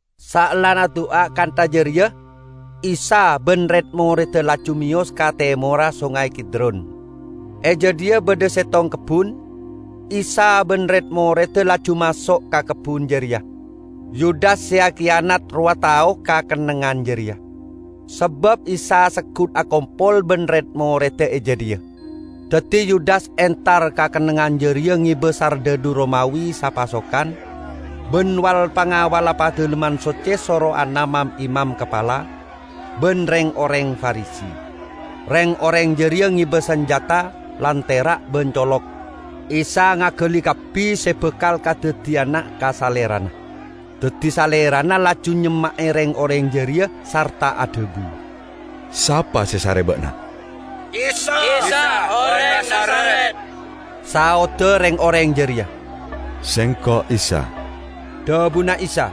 Saellana adu'a kantha jareya Isa ban red-moredda laju meyos ka temorra Songay Kidron. E jadhiya badha settong kebbun, Isa ban red-moredda laju maso' ka kebbun jareya. Yudas se akiyanat rowa tao ka kennengngan jareya; sabab Isa seggut akompol ban red-moredda e jadhiya. Daddi Yudas entar ka kennengngan jareya ngeba sardhadhu Romawi sapasukan ban wal-pangawalla Padalemman Socce sorowanna mam-imam kapala ban reng-oreng Farisi. Reng-oreng jareya ngeba sanjata, lantera' ban colok. Isa ngagali kabbi se bakal kadaddiyana ka Salerana. Daddi Salerana laju nyemma'e reng-oreng jareya sarta adhabu, "Sapa se esare ba'na?" "Isa, oreng Nazaret," saodda reng-oreng jareya. "Sengko' Isa," dhabuna Isa.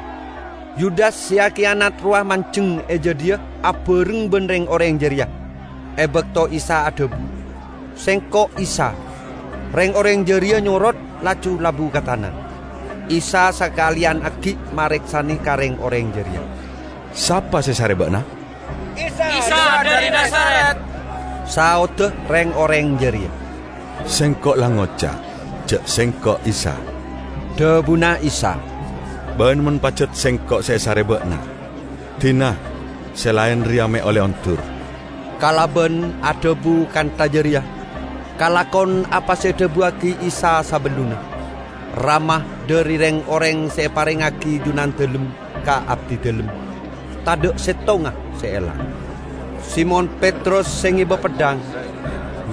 Yudas se akiyanat rowa manjeng e jadhiya abareng ban reng-oreng jareya. E bakto Isa adhabu, "Sengko' Isa," reng-oreng jareya nyorot laju labu ka tana. Isa sakaleyan aggi' mareksane ka reng-oreng jareya, "Sapa se esare ba'na?" "Isa dhari Nazaret," saodda reng-oreng jareya. "Sengko' la ngoca' ja' Sengko' Isa," dhabuna Isa. "Ban mon pajat Sengko' se esare ba'na, dina se laen reya me' olle ondur." ( Kalaban adhabu kantha jareya, kalakon apa se edhabuwagi Isa sabellunna, "Rama, dhari reng-oreng se eparengngagi Junandalem ka Abdidalem, tadha' settonga se elang.") Simon Petrus se ngeba peddhang,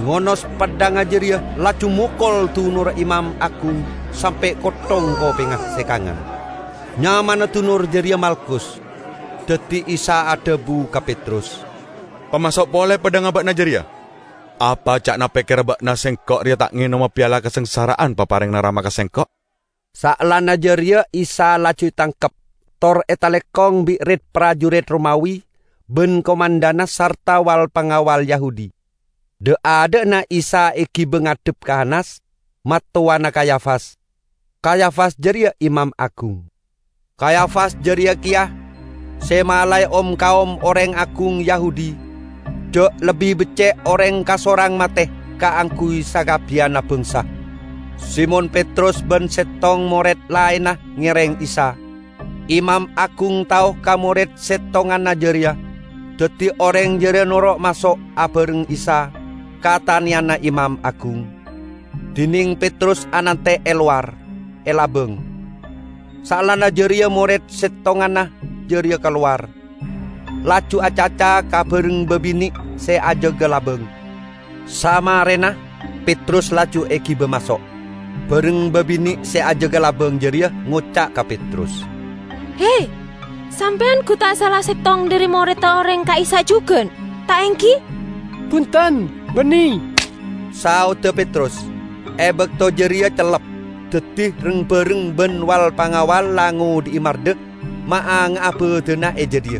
ngonos peddhangnga jareya, laju mokol dunorra imam agung sampe' kotthong kopengnga se kangan. Nyamana dunor jareya Malkus. Daddi Isa adhabu ka Petrus, "Pamaso' pole peddhangnga ba'na jareya! Apa ca'na pekkera ba'na Sengko' reya ta' ngenoma piala kasangsara'an paparengnga Rama ka Sengko'?" Saellana jareya Isa laju etangkep tor etalekong bi' rit-parjurit Romawi ban komandanna sarta wal-pangawal Yahudi. Dha'-adha'na Isa egiba ngadhep ka Hanas, mattowana Kayafas. Kayafas jareya imam agung. Kayafas jareya keya se malae om-kaom oreng agung Yahudi ja' lebbi becce' oreng kasorang mate kaangguy sakabbiyanna bangsa. Simon Petrus ban settong mored laenna ngereng Isa. Imam agung tao ka mored settonganna jareya, daddi oreng jareya noro' maso' abareng Isa ka taneyanna imam agung, dineng Petrus anante' e lowar, e labang. Saellana jareya mored settonganna jareya kalowar, laju acaca ka bareng babine' se ajaga labang; samarena, Petrus laju egiba maso'. Bareng babine' se ajaga labang jareya ngoca' ka Petrus, "He, sampeyan gu ta' sala settong dhari moredda oreng ka'issa' jugan, ta' enggi?" "Bunten, banne," saodda Petrus. E bakto jareya cellep, daddi reng-bareng ban wal-pangawal la ngodhi'i mardha, maanga'a badanna e jadhiya.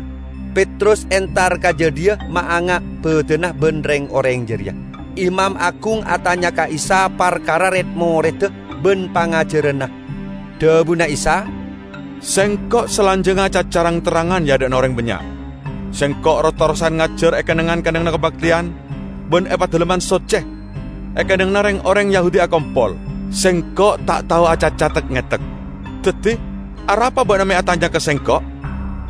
Petrus entar ka jadhiya maanga' badanna ban reng-oreng jareya. Imam agung atanya ka Isa parkara red-moredda ban pangajaranna. Dhabuna Isa, "Sengko' salanjangnga acaca rang-terrangan e adha'na oreng bannya'. Sengko' ros-terrosan ngajar e kennengngan-kennengnganna kabakteyan ban e Padalemman Socce, e kennengnganna reng-oreng Yahudi akompol. Sengko' ta' tao acaca tek-ngetek. Daddi arapa ba'na me' atanya ka Sengko'?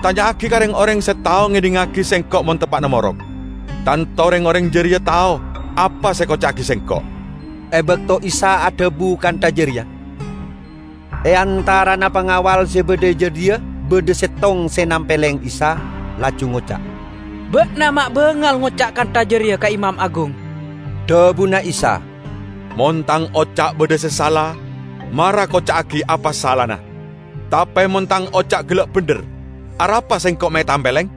Tanya'agi ka reng-oreng se tao ngedhingngagi Sengko' mon teppa'na morok. Tanto reng-oreng jareya tao apa se ekoca'agi Sengko'." E bakto Isa adhabu kantha jareya, e antarana pangawal se badha e jadhiya badha settong se nampeleng Isa laju ngoca', "Ba'na me' bangal ngoca' kantha jareya ka imam agung!" Dhabuna Isa, "Mon Tang oca' badha se sala, mara koca'agi apa salana! Tape mon Tang oca' gella' bendher, arapa Sengko' me' etampeleng?"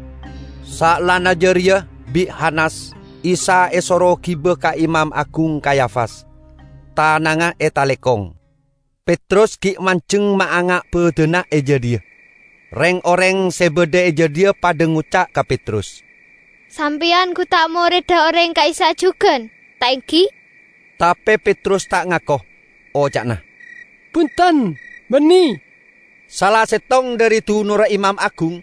Saellana jareya bi' Hanas Isa esoro giba ka Imam Agung Kayafas, tanangnga etalekong. Petrus gi' manjeng maanga' badanna e jadhiya. Reng-oreng se badha e jadhiya padha ngoca' ka Petrus, "Sampeyan gu ta' moredda oreng ka'issa' jugan, ta' enggi?" Tape Petrus ta' ngako, oca'na, "Bunten, banne!" Sala settong dhari dunorra imam agung,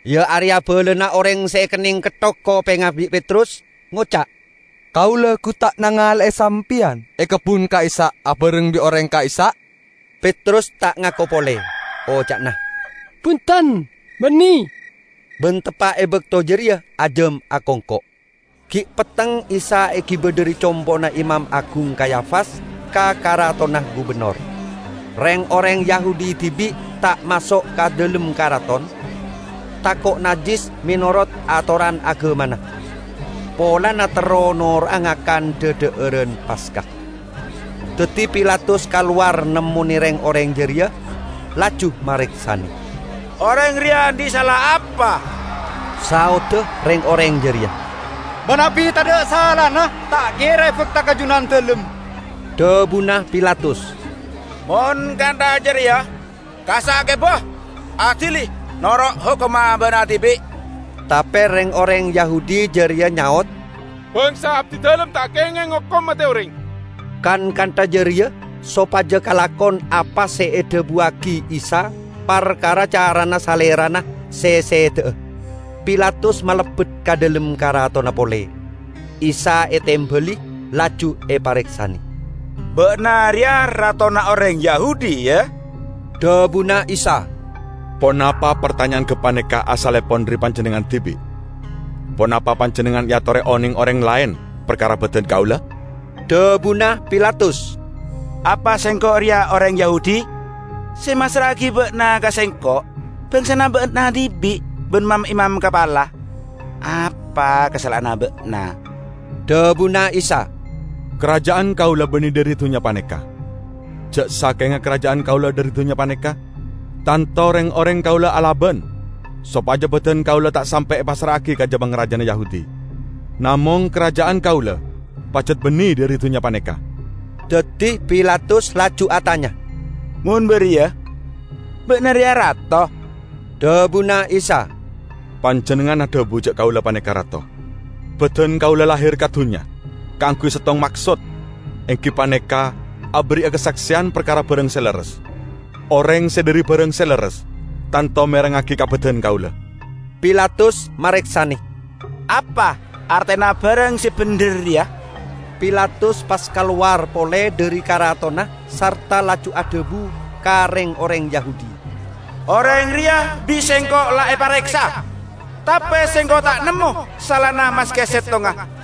iya areya balana oreng se ekenneng ketthok kopengnga bi' Petrus, ngoca', "Kaula gu ta' nangale'e sampeyan e kebbun ka'issa' abareng bi' oreng ka'issa'?" Petrus ta' ngako pole, oca'na, "Bunten, banne!" -- ban teppa' e bakto jareya ajam akongko'. Gi' petteng Isa egiba dhari compo'na Imam Agung Kayafas ka karatonna gubennor. Reng-oreng Yahudi dibi' ta' maso' ka dhalem karaton, tako' najjis menorot atoran agamana, polana terro noro'a ngakan dha-dha'aran Paska. Daddi Pilatus kalowar nemmone reng-oreng jareya, laju mareksane, "Oreng reya andhi' sala apa?" Saodda reng-oreng jareya, "Manabi tadha' salana ta' kera ebakta ka Junandalem." Dhabuna Pilatus, "Mon kantha jareya kassa' giba, adili noro' hokomma ba'na dibi'!" Tape reng-oreng Yahudi jareya nyaot, "Bangsa abdidalem ta' kengeng ngokom mate oreng." ( Kan kantha jareya sopaja kalakon apa se edhabuwagi Isa parkara carana Salerana se seda'a.) Pilatus malebbet ka dhalem karatonna pole; Isa etembali, laju epareksane, "Ba'na reya ratona oreng Yahudi, ya?" Dhabuna Isa, "Ponapa partanya'an gapaneka asallepon dhari panjennengngan dibi', ponapa panjennengngan eatore oneng oreng laen parkara badan kaula?" Dhabuna Pilatus, "Apa sengko' reya oreng Yahudi? Se massra'agi Ba'na ka sengko' bangsana Ba'na dibi' ban mam-imam kapala. Apa kasala'anna Ba'na?" Dhabuna Isa, "Karaja'an Kaula banne dhari dunnya paneka. Ja' sakenga karaja'an Kaula dhari dunnya paneka, tanto reng-oreng Kaula alaban sopaja badan kaula ta' sampe' epassra'agi ka ja-pangrajana Yahudi. Namong karaja'an Kaula pajat banne dhari dunnya paneka!" Daddi Pilatus laju atanya, "Mon bariya, Ba'na reya rato?" Dhabuna Isa, "Panjennengngan adhabu ja' Kaula paneka rato. Badan Kaula lahir ka dunnya kaangguy settong maksod, enggi paneka aberri'a kasakseyan parkara barang se lerres. Oreng se dhari barang se lerres tanto merengngagi ka badan Kaula." Pilatus mareksane, "Apa artena barang se bendher reya?" Pilatus pas kalowar pole dhari karatonna sarta laju adhabu ka reng-oreng Yahudi, "Oreng reya bi' sengko' la epareksa, tape sengko' ta' nemmo salana maske settonga.